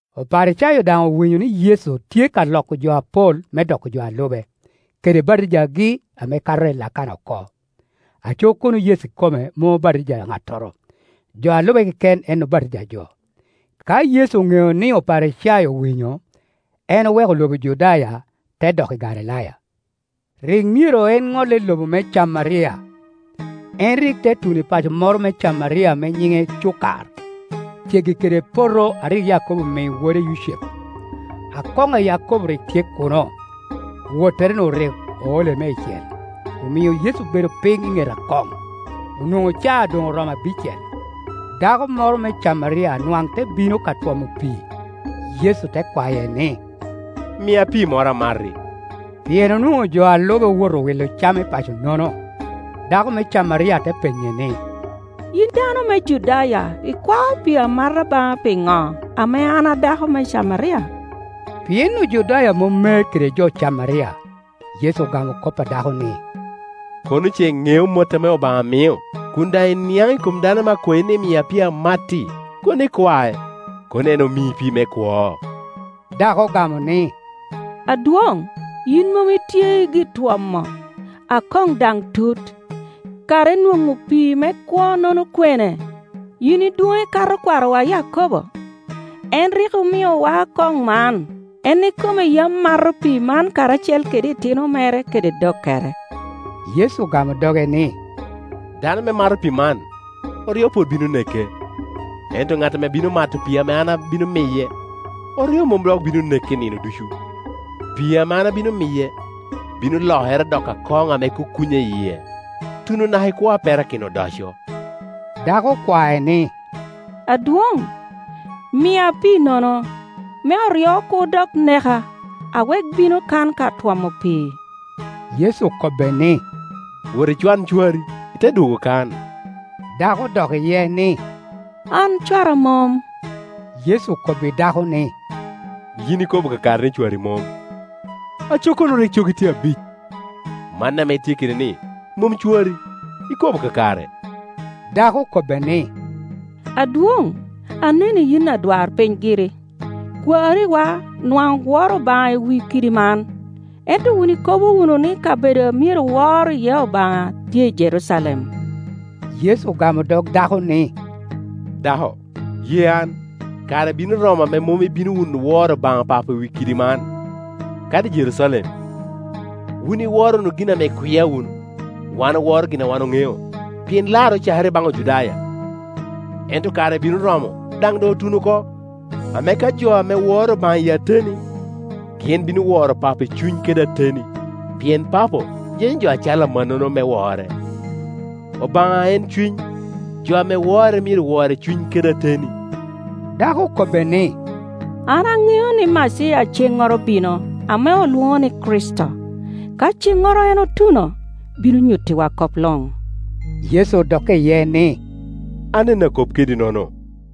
Oparicayo daŋ owinyo ni Yecu tye ka loko jo apol me doko jo a lube, kede batijagi ame kato Lakana oko; aco kono Yecu ikome mom obatija ŋattoro, jo a lube keken en obatija jo. Ka Yecu oŋeo ni Oparicayo owinyo, en oweko lobo Judaya, te dok i Galilaya. Rik myero en ŋolle i lobo me Camaria. En rik te tuno i paco moro me Camaria ame nyiŋe Cukar, ceggi kede poto a rik Yakobo mii wode Yucepu. Akoŋ a Yakobo rik tye kuno, Wottere-nu rik oole meicel, omio Yecu obedo piny i ŋet akoŋ; onwoŋo caa doŋ oromo abicel. Dako moro me Camaria nwaŋ te bino ka twomo pii. Yecu te kwaye ni, “Mia pii moro, amati.” Pien onwoŋo jo a lube owoto wilo cam i paco-nono. Dako me Camaria te penye ni, “Yin dano me Judaya ikwao pii amata baŋa piŋo, ame an a dako me Camaria?” Pien Ojudaya mom mer kede jo Camaria. Yecu ogamo kop a dako ni, “Kono ce iŋeo mot ame Obaŋa mio, kun daŋ iniaŋ i kom dano ame akwayi ni, ‘Mia pii, amat’ ti, kono ikwae, kono en omii pii me kwo.” Dako ogamo ni, “Adwoŋ, yin mom itye i gitwomo, akoŋ daŋ tut; kara inwoŋo pii me kwo-nono kwene? Yin idwoŋ ikato kwarowa Yakobo? En rik omiowa akoŋ man, en ikome yam mato pii man, karacel kede itino mere kede dokkere.” Yecu ogamo doge ni, “Dano ame mato pii man, oryo pwod bino neke, ento ŋat ame bino mato pii ame an abino miye, oryo mom dok bino neke nino ducu. Pii ame an abino miye bino lokere doko akoŋ ame kukunya i yie, tuno naka i kwo a perakino odoco.” Dako okwae ni, “Adwoŋ, mia piinono, me oryo kur dok neka, awek bino kan ka twomo pii.” Yecu okobbe ni, “Wot icwan cwari, ite dwogo kan.” Dako odok iye ni, “An cwara mom.” Yecu okobbi dako ni, “Yin ikobo kakare ni cwari mom. Aco kono rik cogi tye abic, man ame itye kede-ni mom cwari, ikobo kakare.” Dako okobbe ni, “Adwoŋ, aneni yin adwarpiny giri. Kwariwa nwaŋ woro Obaŋa i wi kidi man, ento wun ikobo wunu ni kabedo a myero wor iye Obaŋa tye i Jerucalem.” Yecu ogamo dog dako ni, “Dako, ye an; kare bino romo ame mom ibino wunu woro Obaŋa Papo i wi kidi man, kadi i Jerucalem. Wun iworo wunu gin ame ikwia wunu, wan oworo gin a wan oŋeo, pien larre ocakere i baŋ Ojudaya. Ento kare bino romo, daŋ doŋ otuno oko, ame ka jo ame woro Obaŋa i ateni, gin bino woro Papo i cuny kede ateni, pien Papo yenyo jo a cal amannono me wore. Obaŋa en cuny, jo ame wore myero wore i cuny kede ateni.” Dako okobbe ni, “An aŋeo ni Maciya ceŋŋoro bino (ame olwoŋo ni, Kricito): ka ceŋŋoro en otuno, bino nyuttiwa kop luŋ.” Yecu odokke iye ni, “An en a kop kedi-nono.”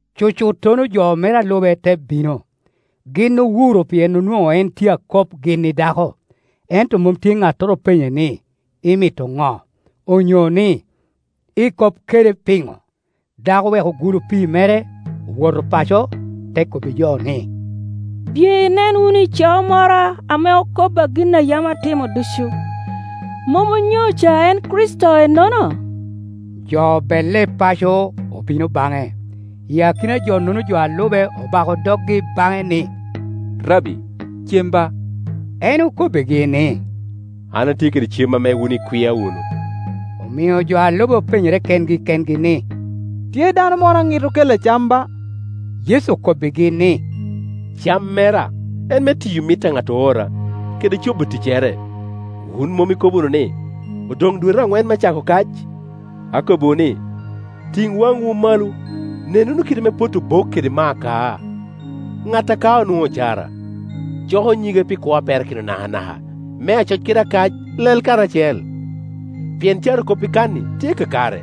Cucuttono jo mere a lube te bino. Gin owuro pien onwoŋo en tye a kop gin i dako, ento mom tye ŋattoro openye ni, “Imito ŋo?” onyo ni, “Ikop kede pino?” Dako oweko gulu pii mere, owoto paco, te kobbi jo ni, “Biye inen wunu ico moro ame okobba gin a yam atimo ducu. Mom onyo ca en Krici to ennono?” Jo obelle i paco, obino baŋe. I akina-nono jo a lube obako doggi baŋe ni, “Rabbi, cem ba.” En okobbigi ni, “An atye kede cem ame wun ikwia wunu.” Omio jo a lube openyere kengi kengi ni, “Tye dano moro a ŋit okelle cam ba?” Yecu okobbigi ni, “Cam mera en me tiyo mit a ŋat oora, kede cobo ticcere. Wun mom ikobo wunu ni, ‘Odoŋ dwete aŋwen me cako kac?’ Akobbiwu ni, ‘Tiŋ waŋwu malo, nen wunu kit ame potti obok kede ma akaa. Ŋat a kao nwoŋo ocara, coko nyige pi kwo a perakino nakanaka, me acoc kede akac lel karacel.’ Pien carokop i kan-ni tye kakare,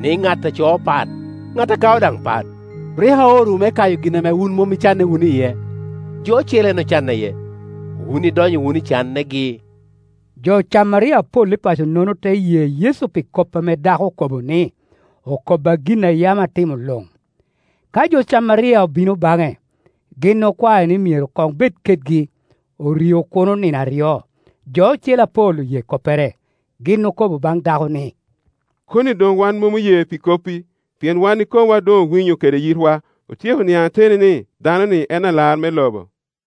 ni, ‘Ŋat a coo pat, ŋat a kao daŋ pat.’ Rik aorowu me kayo gin ame wun mom icanne wunu iye; jo ocele en ocanne iye, wun idonyo wunu i cannegi.” Jo Camaria apol i paco-nono te ye Yecu pi kop ame dako okobo ni “Okobba gin a yam atimo luŋ.” Ka jo Camaria obino baŋe, gin okwae ni myero koŋ bed kedgi; orio kuno nino aryo. Jo ocele apol oye koppere. Gin okobo baŋ dako ni “Koni doŋ wan mom oye pi koppi: pien wan ikomwa doŋ owinyo kede yitwa, otyeko niaŋ ateni ni, dano-ni en Alar me lobo.”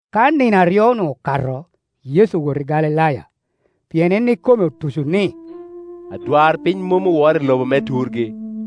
Ka nino aryo-nu okato, Yecu owoto i Galilaya. Pien en ikome otuco ni, “Adwarpiny mom oworo i lobo me turgi.”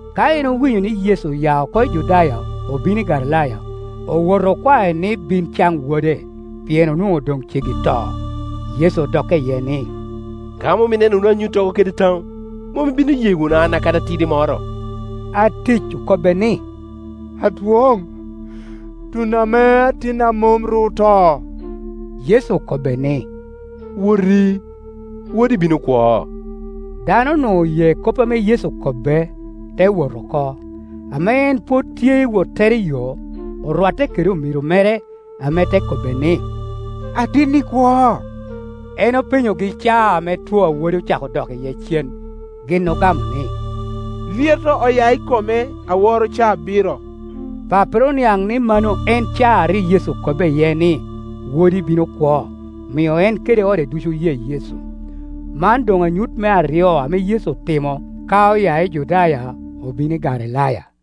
Ka en owinyo ni Yecu oya oko i Judaya, obino i Galilaya, owoto okwae ni bin caŋ wode, pien onwoŋo doŋ ceggi to. Yecu odokke iye ni, “Ka mom ineno wunu anyuttogo kede taŋo, mom ibino ye wunu an kadi atidi moro.” Atic okobbe ni, “Adwoŋ, tun ame atinna mom ru oto.” Yecu okobbe ni, “Woti; wodi bino kwo.” Dano-nu oye kop ame Yecu okobbe, te wot oko. Ame en pwod tye i wottere iyo, orwatte kede omiro mere, ame te kobbe ni, “Atinni kwo.” En openyogi caa ame two a wode ocako dok iye cen. Gin ogamo ni, “Lyeto oya i kome aworo caa abiro.” Pappere oniaŋ ni mano en caa a rik Yecu okobbe iye ni, “Wodi bino kwo”; omio en kede ode ducu oye Yecu. Man doŋ anyut me aryo ame Yecu otimo ka oya i Judaya, obino i Galilaya.